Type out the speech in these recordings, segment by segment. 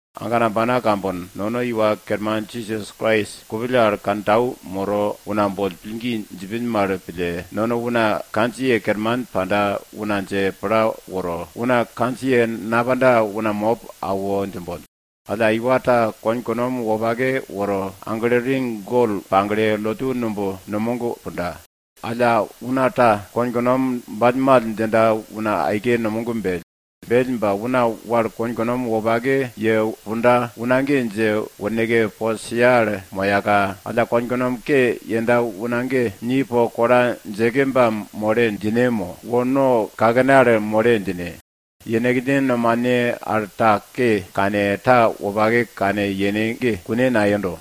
Agana ambana kambono, nono Iwa Kerman Jisas Krais, kupill al kantau moro una boll pillgi djipin mal pille, nono una kandjiye kerman panda una dje pla woro, una kandjiye napanda una mop awo djimbon. Iwa ta konkunom wopake woro, agle ring gol pagle, lotu numb numog punda. Alla una ta konkunom ballmall djinda una aike numog bell. Bell ba, una wal konkunom wopake ye punda una ge dje worneke, bo sia al moyaka, alla konkunom ke yenda una ge, ni po kola djeke ba mole djine mo, wo no kakene al mole djine. Yenekne nomane al ta ke kane, ta wopake kane yene ge kune nayendo.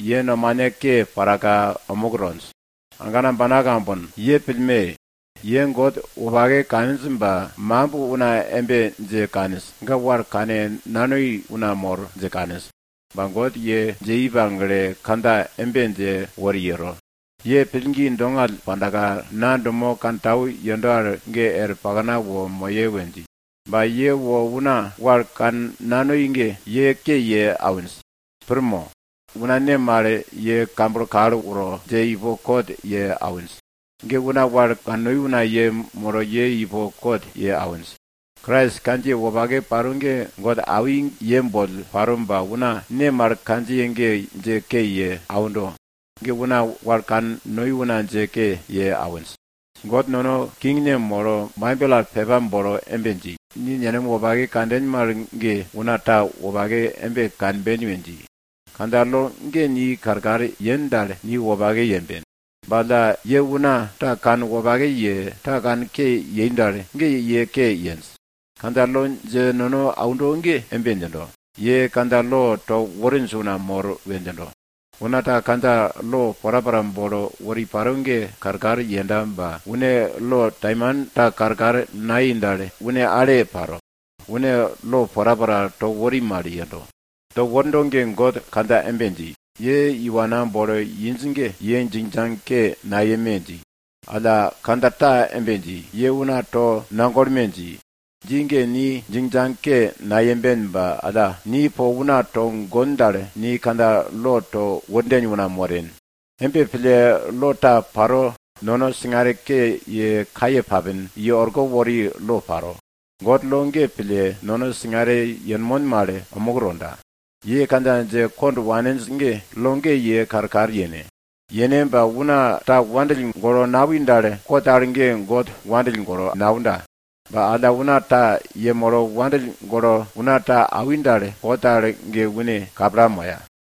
Ye nomane ke paraka omuk tonj. Agana ambana kambono, ye pillme! Ye God wopake kaninj ba makimb una embe dje kaninj, ga wal kannanoi una mor dje kaninj. Ba God ye dje i pagle, kandja embe dje wori yero, ye pillgi dongall pandaka na dumo wopake kantau yendo al ge er pakna wo moye we dji. Ba ye wo una wal kannanoi ge, ye ke ye awinj. Pir mo? Una ne mal ye kamblo kal woro, dje ipo kot ye awinj? Ge una wal kannonj una yemolo ye ipo kot ye awinj. Krais kandjiye wopake paro ge God awi ye boll paro ba una ne mal kandjiye ge dje ke ye aundo? Ge una wal kannonj una dje ke ye awinj. God nono Kingne molo Baibel al pepa bolo embe dji, ni nenem wopake kanden mal ge, una ta wopake embe kanben we dji. Kandja lo ge ni karkar yen dal, ni wopake yemben. Ba alla, ye una ta kanwopake ye, ta kanke yei dal, ge ye ke yenj. Kandja lo dje nono aundo ge, embe djindo, ye kandja lo to worinj una mor we djindo. Una ta kandja lo porapora bolo wori paro ge karkar yenda ba, une lo taimanta karkar nayei dal, une ale paro, une lo porapora to wori mal yendo. To wordo ge, God kandja embe dji, ye iwa ta game mo, ana ta woge boll djingjang nayeme dji. Alla kandja ta embe dji, ye una tonagolme dji. Dji ge, ni djingjang nayemben ba alla, ni po una togon dal, ni kandja lo to worden una moren. Embe pille, lo ta paro, nono singare ke ye kaye papin i orko wori lo ta paro. God lo ge pille, nono singare yenmon mal omuk tonda. Ye kandja dje kond waninj ge, ye lo ge pille karkar yene. Una ta wandill golo nawi dal, kot al ge God wandill golo naunda. Ba alla una ta yemolo wandill golo una ta awi dal, kot al ge une kapla moya.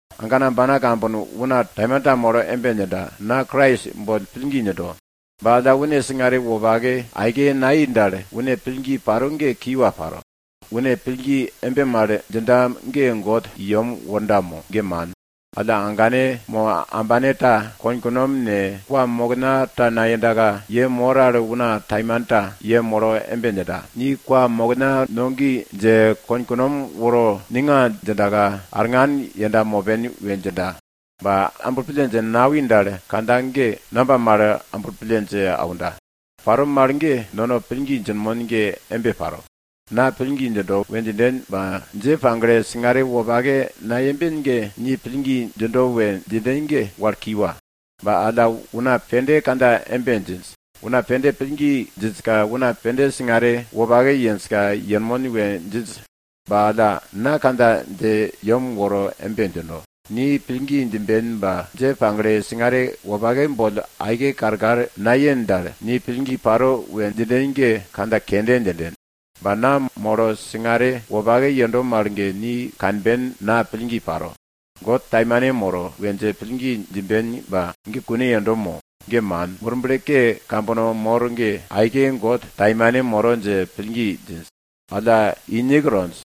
Agana ambana kambono, una taimanta molo embe djinda, na Krais boll pillgi djindo. Ba alla une singare wopake aike nayei dal, une pillgi paro ge kiwa paro. Une pillgi embe mal djinda ge, God i yem worda mo? Ge man. Alla agane mo ambane ta konkunom ne, kwamokna ta nayendaka, ye mor al una taimanta yemolo embe djinda, ni kwamokna no gi dje, konkunom woro ninga djindaka, ellin tukin arngan yenda mopen we djinda. Ba amblo pille dje nawi dal, kandja ge namba mal amblo pille dje aunda? Paro mal ge, nono pillgi djinmon ge embe paro. Na pillgi djindo we djinden ba dje pagle, singare wopake nayemben ge, ni pillgi djindo we djinden ge, wal kiwa. Ba una pende kandja embe djinj, una pende pillgi djinjka, una pende singare wopake yenjka yenmon we djinj. Ba alla na kandja dje yem woro embe djino, ni pillgi djimben ba, dje pagle singare wopake boll aike karkar nayen dal, ni pillgi paro we djinden ge kandja kende djinden. Ba na molo singare wopake yendo mal ge, ni kanben na pillgi paro. God taimane moro we dje pillgi djimben ba, ge kune yendo mo? Ge man! Murble ke kambono mor ge aike God taimane moro dje pillgi djinj ba alla inik tonj.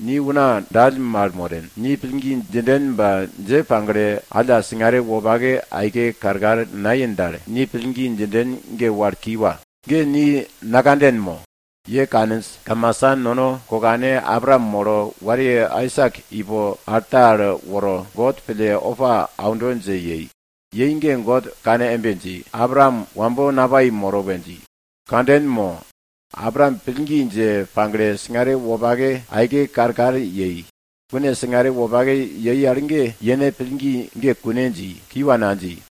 Ni una dall mal moren! Ni pillgi djinden ba, dje pagle alla singare wopake aike karkar nayen dal, ni pillgi djinden ge, wal kiwa, ge ni nakanden mo? Ye kaninj, kamasa nono kokane Abraam molo wariye Aisak ipo alta al woro, God pille opa auno dje yei. Yei ge, God kane embe dji, Abraam wambo napai moro we dji. Kanden mo? Abraam pillgi dje pagle, singare wopake aike karkar yei. Une singare wopake yei al ge, yene pillgi dji ge kune dji, kiwa nadji.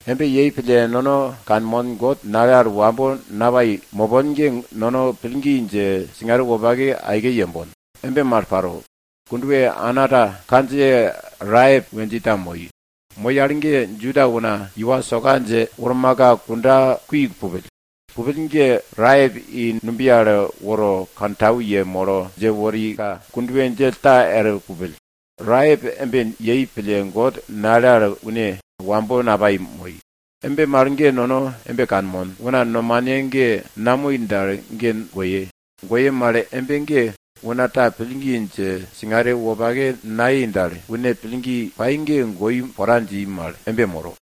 Embe yei pille nono kanmon, God nale al wambo napanda mopon ge, nono pillgi dje, singare wopake aike yembon. Embe mal paro, kondwe ana ta kandjiye Raep we dji ta moi. Moi al ge, Juda una iwa soka dje wormaka, kunda kui pupill. Pupill ge, Raep i numbiye al woro kantau yemolo, dje worika, kondwe djell ta er pupill. Raep embe yei pille, God nale al une wambo napai moi. Embe mal ge, nono embe kanmon, una nomane ge namoi dal ge goye. Goye mal embe ge, una ta pillgi dje singare wopake nayei dal, une pillgi pai ge goi pora dji mal embe moro.